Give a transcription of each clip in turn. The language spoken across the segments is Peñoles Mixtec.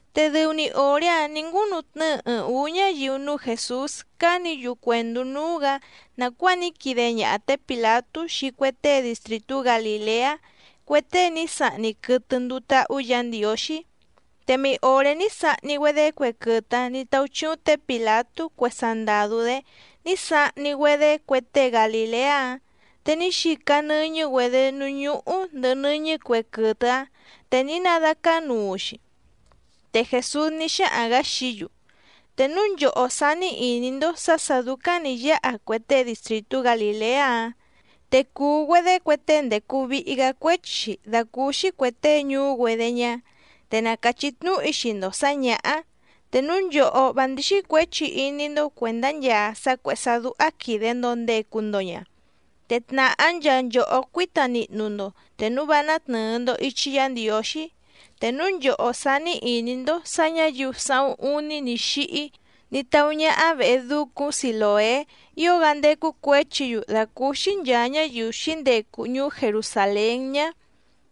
Te dɨu‑ni òré‑áⁿ nǐ ngúnutnɨ́ɨ ɨɨⁿ ǔú ñáyiu núú Jèsús cánǐ‑yu cuèndú núú‑gǎ nàcuáa ní quide ñaha té Pìlatú xii cue tée distrìtú Galìleá cue tée ní sahni quɨtɨ nduu táhú Yǎ Ndiǒxí, te mei òré ní sahni‑güedé cue quɨtɨ‑áⁿ nǐ táúchíúⁿ tě Pìlatú cue sandàdú‑dé ní sahni‑güedé cue tée Galìleá‑áⁿ, te ní xica nɨ́ñɨ́‑güedě núú ñúhú ndɨ̀hɨ nɨ́ñɨ́ cue quɨtɨ‑áⁿ, te ní nadácánuu‑xi. Te Jèsús ní xáhaⁿ‑gǎ xií‑yu: —Te núu nchòhó sání ìní‑ndó sǎ sà dúcáⁿ nǐ yáha cue tée distrìtú Galìleá‑áⁿ te cùu‑güedé cue tée ndècu vihi‑gá cuéchi‑xi dàcúúxí cuè tée ñuú‑güedé ñá. Te na càchí tnúhu‑í xii‑ndo sǎ ñǎhá. Te núu nchòhó vá ndíxí cuěchi iní‑ndó cuèndá nchaa sá cuèhé sá dúhá quìde‑ndo ndecu‑ndo ña, te tnàhá nchaa nchòhó cuíta nihnu‑ndo te núu vá nátnɨ̀ɨ‑ndo ichi Yá Ndiǒxí. Te núu nchòhó sání ìní‑ndó sǎ ñǎyiu sáhúⁿ úní ní xíhí ní táú ñáhá vèhe ducúⁿ Silòé ío‑gá ndécú cuěchi‑yu dàcúúxí nchàa ñáyiu xǐndecu ñuú Jerusàlén ñá,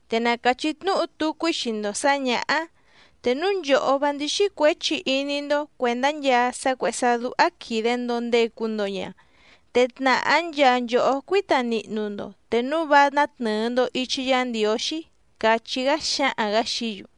te na càchí tnúhu tucu‑í xii‑ndo sǎ ñǎhá. Te núu nchòhó vá ndíxí cuěchi iní‑ndó cuèndá nchaa sá cuèhé sá dúhá quìde‑ndo ndecu‑ndo ña, te tnàhá nchaa nchòhó cuíta nihnu‑ndo te núu vá nátnɨ̀ɨ‑ndo ichi Yá Ndiǒxí —càchí‑gá xáhaⁿ‑gǎ xií‑yu.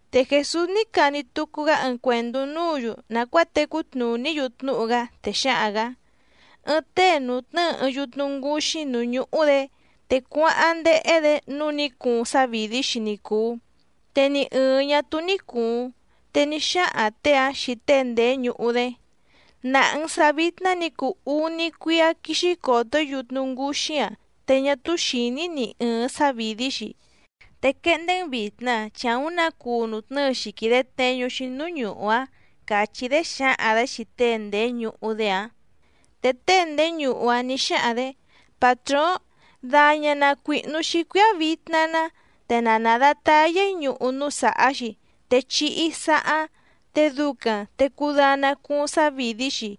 Te Jèsús ní cani tucu‑gá ɨɨⁿ cuèndú núǔ‑yu nàcuáa tecú tnùní‑yu tnúhu‑gá, te xáhaⁿ‑gǎ: —Ɨɨⁿ tée nùtnɨ́ɨ ɨɨⁿ yutnu ngǔxí núú ñúhú‑dě, te cuáháⁿ ndéhé‑dě nǔu ní cuuⁿ sávìdí‑xi ni cùu, te ni ɨ̀ɨⁿ ñá túú ní cùuⁿ. Te ní xáhaⁿ těe‑áⁿ xii tée ndèé ñuhu‑dé: “Nàha‑n sá vìtna ní cuu úní cuíá quíxí còto‑í yutnu ngǔxí‑a te ñá túú xìní‑í ni ɨ̀ɨⁿ sávìdí‑xi. Te quehndé‑n vìtna, chi àúⁿ nǎ cuu nùtnɨ́ɨ‑xi quìde tneñu‑xi núú ñuhu‑áⁿ”, càchí‑dé xǎhaⁿ‑dě xii tée ndèé ñuhu‑dé‑áⁿ. Te tée ndèé ñuhu‑áⁿ nǐ xáhaⁿ‑dě: “Pàtróóⁿ, daña na cuìhnu‑xi cuíá vitna‑ná, te na nàdatayá‑í ñuhu núú sàhá‑xi, te chihi‑í saháⁿ. Te ducaⁿ te cudana cuuⁿ sávìdí‑xi,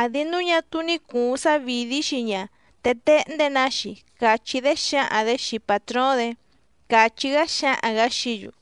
àdi núu ñá túú ní cùuⁿ sávìdí‑xi ña te téhndé‑nǎ‑xi”, càchí‑dé xǎhaⁿ‑dě xii pàtróóⁿ‑dě —càchí‑gá xáhaⁿ‑gǎ xií‑yu.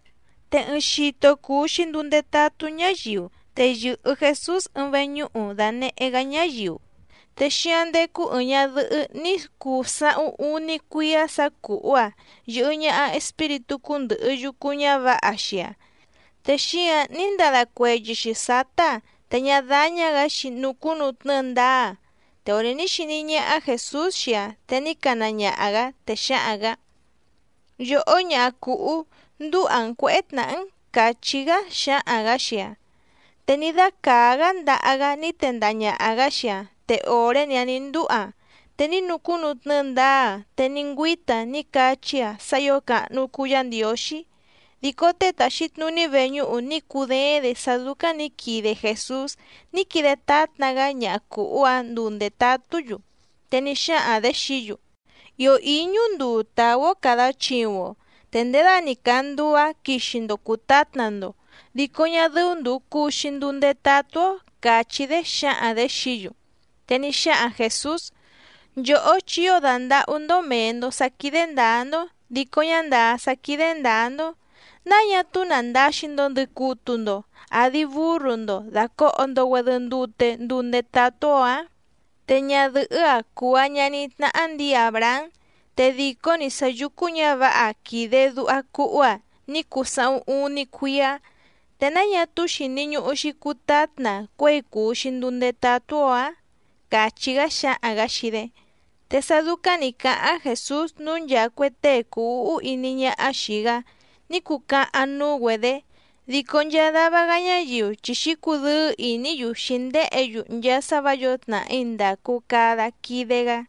Te ɨɨⁿ xito cùu‑xi nduu ndetatú ñáyiu, te yɨ̀hɨ Jesús ɨɨⁿ veñúhu dànehé‑gá ñáyiu. Te xíáⁿ ndécú ɨ̀ɨⁿ ñadɨhɨ́ ní cuu sáhúⁿ úní cuíá sǎ cùhú‑aⁿ yɨ̀hɨ ñaha espíritú cúndɨ̀hɨ yucu ñávǎha xii‑aⁿ, te xíǎⁿ ní ndada cueyɨ‑xi sǎtá‑aⁿ, te ñá dáñá‑gǎ‑xi nucúnutnɨ́ɨ ndáá‑aⁿ. Te òré ní xiní ñáhá Jèsús xii‑aⁿ te ní cana ñaha‑gǎ, te xáhaⁿ‑gǎ: —Yòhó ñaha cùhú, ndúha‑n cuěhé tnàhá‑n —càchí‑gá xáhaⁿ‑gǎ xii‑aⁿ. Te ní dácàá‑gá ndaha‑gá ní tendaha ñàha‑gá xii‑aⁿ, te òré‑ni‑áⁿ nǐ ndúha‑aⁿ te ní nucúnutnɨ́ɨ ndáá‑aⁿ, te ní ngüíta‑aⁿ ní cachí‑aⁿ sá ǐo càhnu cuu Yá Ndiǒxí. Dico tée tàxi tnuní veñúhu ní cudééⁿ‑dě sá dúcáⁿ nǐ quide Jèsús ní quide tátna‑gá ñaha cùhú‑áⁿ nduu ndètatú‑yu, te ní xáhaⁿ‑dě xií‑yu: —Ìó íñú nduu tàú‑ó càda chiuⁿ‑o, te ndědani càa nduu‑áⁿ quixi‑ndo cùtátna‑ndo, dico ñá dɨ́ú ndùu cuu‑xi nduu ndetatú‑ó —càchí‑dé xǎhaⁿ‑dě xií‑yu. Te ní xáhaⁿ Jèsús: —Nchòhó chi ío dàndahú‑ndó mèe‑ndo sá quídé ndǎá‑ndó dico ñá ndàá sá quídé ndǎá‑ndó, ¿náa ñá túú nàndaxi‑ndo ndɨcutu‑ndo àdi búrru‑ndo dàcoho‑ndo‑güedɨ ndute nduu ndetatú‑ó ǎⁿ? Te ñadɨ̀hɨ́‑a cùu‑aⁿ ñaní tnáhá ndǐi Àbrahám, te dìcó‑ni sá yùcu ñávǎha quìde duha cuhú‑aⁿ ní cuu sáhúⁿ úní cuíá, ¿te náa ñá túú xìni ñuhu‑xi cutátna‑aⁿ cuěi cùu‑xi nduu ndetatú‑ó ǎⁿ? —càchí‑gá xáhaⁿ‑gǎ xii‑dé. Te sá dúcáⁿ nǐ cáháⁿ Jèsús, núu nchaa cue tée cùu úhú iní ñáhá xìi‑gá ní cucahaⁿ núú‑güedě, dico nchaa dava‑gá ñáyiu chi xǐcudɨ́ɨ́ ìní‑yu xǐndéhě‑yu nchaa sá vǎ yǒo tnàhí ndàcu cada quide‑gá.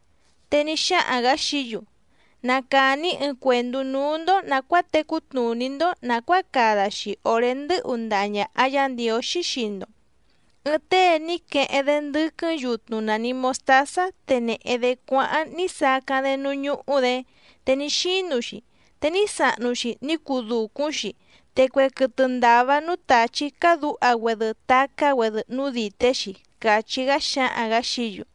Te ní xáhaⁿ‑gǎ xií‑yu: —Na càni‑í ɨɨⁿ cuèndú núú‑ndó nàcuáa tecú tnùní‑ndó nàcuáa cada‑xi òré ndɨ́hu ndaha ñàha Yá Ndiǒxí xii‑ndo. Ɨɨⁿ tée ní queheⁿ‑dé ndɨ́quɨ́ⁿ yutnu nàni mostázá te nèhe‑dé cuáháⁿ ní sacáⁿ‑dé núú ñúhú‑dě te ní xínu‑xi, te ní sahnu‑xi ní cuu dùcúⁿ‑xi, te cue quɨtɨ ndàva núú tàchí cádǔha‑güedɨ tacá‑güedɨ núú dìté‑xi —càchí‑gá xáhaⁿ‑gǎ xií‑yu.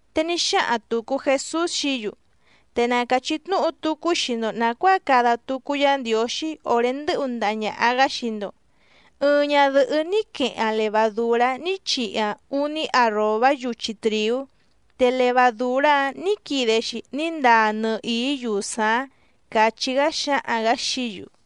Te ní xáhaⁿ tùcu Jesús xií‑yu: —Te na càchí tnúhu tucu‑í xii‑ndo nàcuáa cada tucu Yá Ndiǒxí òré ndɨ́hu ndaha ñàha‑gá xii‑ndo. Ɨɨⁿ ñadɨ̀hɨ́ ní queheⁿ‑aⁿ levadùrá ní chihi‑aⁿ úní arròbá yuchi trìú, te levadùrá‑áⁿ nǐ quide‑xi ní ndaa nɨhìí yusaⁿ‑áⁿ —càchí‑gá xáhaⁿ‑gǎ xií‑yu.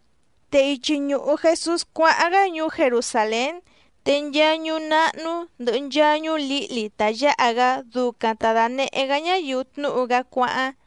Te ichi ñùhu Jesús cuáháⁿ‑gá ñuú Jerusàlén, te nchaa ñuú náhnú, ndɨ̀hɨ nchaa ñuú lǐhli ta yǎha‑gá ducaⁿ ta dànehé‑gá ñáyiu tnúhu‑gá cuáháⁿ.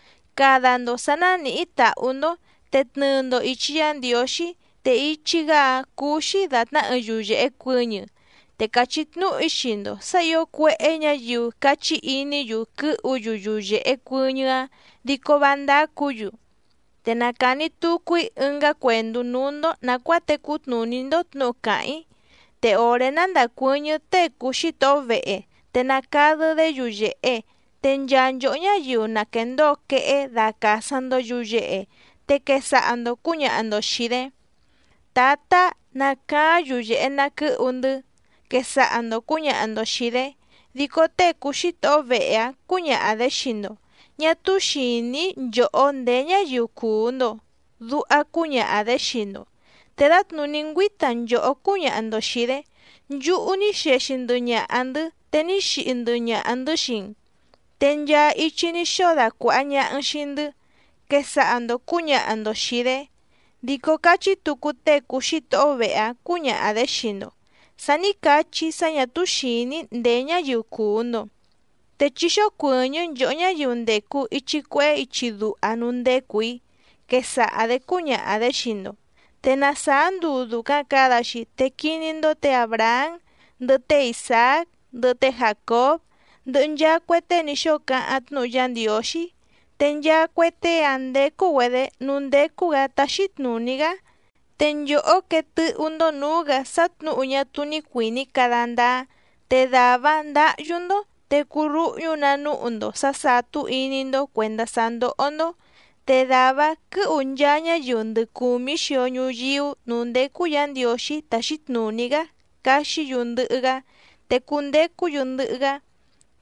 —Cada‑ndo sǎ nánìhí tàhú‑ndó, te tnɨɨ‑ndo ìchi Yá Ndiǒxí, te ichi‑gá‑áⁿ cúú‑xí dàtná ɨɨⁿ yuyèhe cuɨñɨ, te càchí tnúhu‑í xii‑ndo sǎ ǐo cuéhé ñǎyiu cachí iní‑yu quɨ́hu‑yu yuyèhe cuɨñɨ́‑áⁿ dico vá ndácǔ‑yu. Te na càni tucu‑í ɨngá cuèndú núú‑ndó nàcuáa tecú tnùní‑ndó tnǔhu càháⁿ‑í. Te òré ná ndàcuɨ́ñɨ́ tée cùu xítohó vehe, te nacadɨ́‑dé yuyèhe, te nchaa nchòhó ñáyiu na quèndóo quehé dacàsaⁿ‑ndo yuyehe, te quesaha‑ndo cǔñaha‑ndo xìi‑dé: “Tǎtá, nacaáⁿ yuyèhe na quɨ́hu‑ndɨ́”, quesaha‑ndo cǔñaha‑ndo xìi‑dé. Dico tée cùu xítohó vehe‑áⁿ cǔñaha‑dě xii‑ndo: “Ñá túú xìní‑í nchòhó ndèé ñáyiu cùu‑ndo”, duha cúñaha‑dě xii‑ndo. Te dǎtnùní ngüíta nchòhó cúñaha‑ndo xìi‑dé: “Nchúhú ní xexi ndɨhɨ ñaha‑ndɨ̌, te ní xihi ndɨhɨ ñaha‑ndɨ̌ xii‑n, te nchaa ichi ní xóo dacuàha ñaha‑n xii‑ndɨ́”, quesaha‑ndo cǔñaha‑ndo xìi‑dé. Dico cachí tucu tée cùu xítohó vehe‑áⁿ cǔñaha‑dě xii‑ndo: “Sa ní cachí‑í sá ñà túú xìní‑í ndèé ñáyiu cùu‑ndo. Te chí xócuɨ̀ñɨ́ nchòhó ñáyiu ndècu ichi cuehé ichi duha núú ndècu‑í”, quesaha‑dě cúñaha‑dě xii‑ndo. Te na sàá nduu dùcaⁿ cada‑xi te quiní‑ndó tě Àbrahám, ndɨhɨ té Isàác, ndɨhɨ té Jàcób, ndɨhɨ nchaa cue tée ní xóo cáháⁿ tnúhu Yá Ndiǒxí, te nchaa cue tée‑áⁿ ndécú‑güedě núú ndécú‑gǎ táxí tnùní‑gá, te nchòhó quee tɨ́hú‑ndó nǔú‑gǎ sá tnǔhu ñá túú ní cuìní cada ndáá, te dàvá‑áⁿ ndǎhyú‑ndó te cuu rúhñú‑nǎ núhu‑ndo sǎ sàtú iní‑ndó cuèndá sá ndóhó‑ndó. Te dàvá‑áⁿ quɨ̌hu nchaa ñáyiu ndɨ cùmí xio ñuyíú nǔú ndécú Yǎ Ndiǒxí táxí tnùní‑gá caxí‑yu ndɨhɨ‑gá, te cundecú‑yu ndɨhɨ‑gá.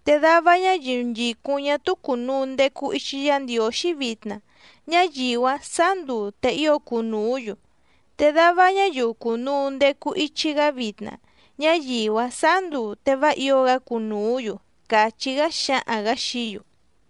Te dava ñáyiu nchìcúⁿ ñá túú cùnuu ndecu ichi Yá Ndiǒxí vitna, ñáyiu‑áⁿ sǎá nduu te ío cunùú‑yu. Te dava ñáyiu cùnuu ndecu ichi‑gá vitna, ñáyiu‑áⁿ sǎá nduu te vá ǐo‑gá cunùú‑yu —càchí‑gá xáhaⁿ‑gǎ xií‑yu.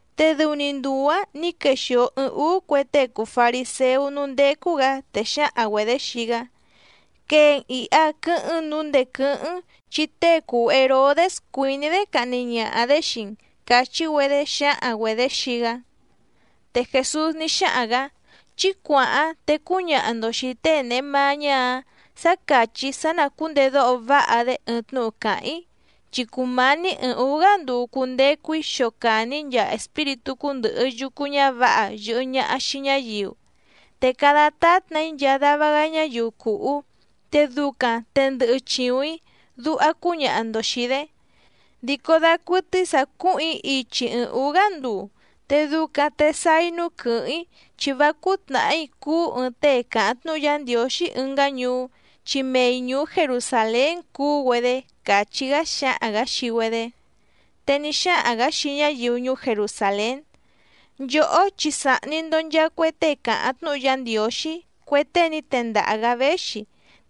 Te dɨu‑ni nduu‑ǎⁿ nǐ quexìo ɨɨⁿ úú cue tée cùu fariséú núú ndécú‑gǎ, te xǎhaⁿ‑güedě xii‑gá: —Quee‑n ìha quɨ́hɨ́ⁿ‑n nǔu ndèé quɨ́hɨ́ⁿ‑n, chi tée cùu Herodés cuìní‑dé cahni ñaha‑dě xii‑n —càchí‑güedé xǎhaⁿ‑güedě xii‑gá. Te Jèsús ní xáhaⁿ‑gǎ: —Chí cuàháⁿ te cúñaha‑ndo xìi tée nèhe mañá‑áⁿ sǎ càchí‑í sá ná cùndedóho váha‑dé ɨɨⁿ tnúhu càháⁿ‑í, chi cùmání ɨɨⁿ ǔú‑gá nduu cundecu‑í xocàni‑í nchaa espíritú cúndɨ̀hɨ yucu ñávǎha yɨ̀hɨ ñaha xii ñáyiu, te cada tátna‑í nchaa dava‑gá ñáyiu cùhú, te ducaⁿ te ndɨhɨ chìuⁿ‑í, duha cúñaha‑ndo xìi‑dé. Dico dacuɨtɨ́í sǎ cúhùⁿ‑í ichi ɨɨⁿ ǔú‑gá nduu, te ducaⁿ te sáá‑í núú quɨ̀hɨ́ⁿ‑í, chi vá cúú tnàhí cuú ɨɨⁿ tée càháⁿ tnúhu Yá Ndiǒxí ɨngá ñuú, chi mei ñùú Jerusàlén cuú‑güedé —càchí‑gá xáhaⁿ‑gǎ xii‑güedé. Te ní xáhaⁿ‑gǎ xii ñáyiu ñuú Jerusàlén: —Nchòhó chi sàhni‑ndo nchaa cue tée càháⁿ tnúhu Yá Ndiǒxí, cue tée ní tendaha‑gǎ véxi,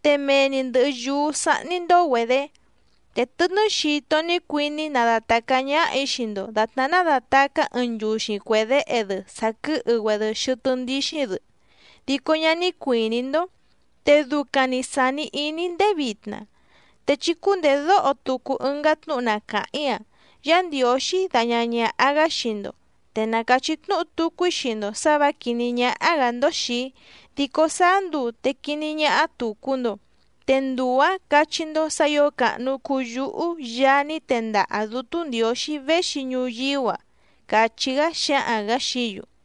te mee‑ni ndɨ̀hɨ yúú sáhní‑ndó‑güedě. ¡Te tɨtnɨ́ xito ní cuiní‑í nadatàcá ñáhà‑í xii‑ndo dàtná nádàtacá ɨɨⁿ nchuxi cuè déhe‑dɨ sàquɨhɨ‑güedɨ xɨtɨ́ ndíxíⁿ‑dɨ, dico ñá ní cuìní‑ndó, te ducaⁿ‑ni sàni iní‑í ndéé vitna! Te chí cúndèdóho tucu ɨngá tnúhu na càháⁿ‑í‑a: Yá Ndiǒxí daña ñàha‑gá xii‑ndo. Te na càchí tnúhu tucu‑í xii‑ndo sǎ vǎ quìní ñáhá‑gǎ‑ndó xìi‑í, dico sáá nduu te quiní ñáhá tùcu‑ndo, te nduu‑ǎⁿ cachí‑ndó sǎ ǐo càhnu cuu yúhú Yaá ní tendaha Dǔtú Ndiǒxí véxi ñuyíú‑a —càchí‑gá xáhaⁿ‑gǎ xií‑yu.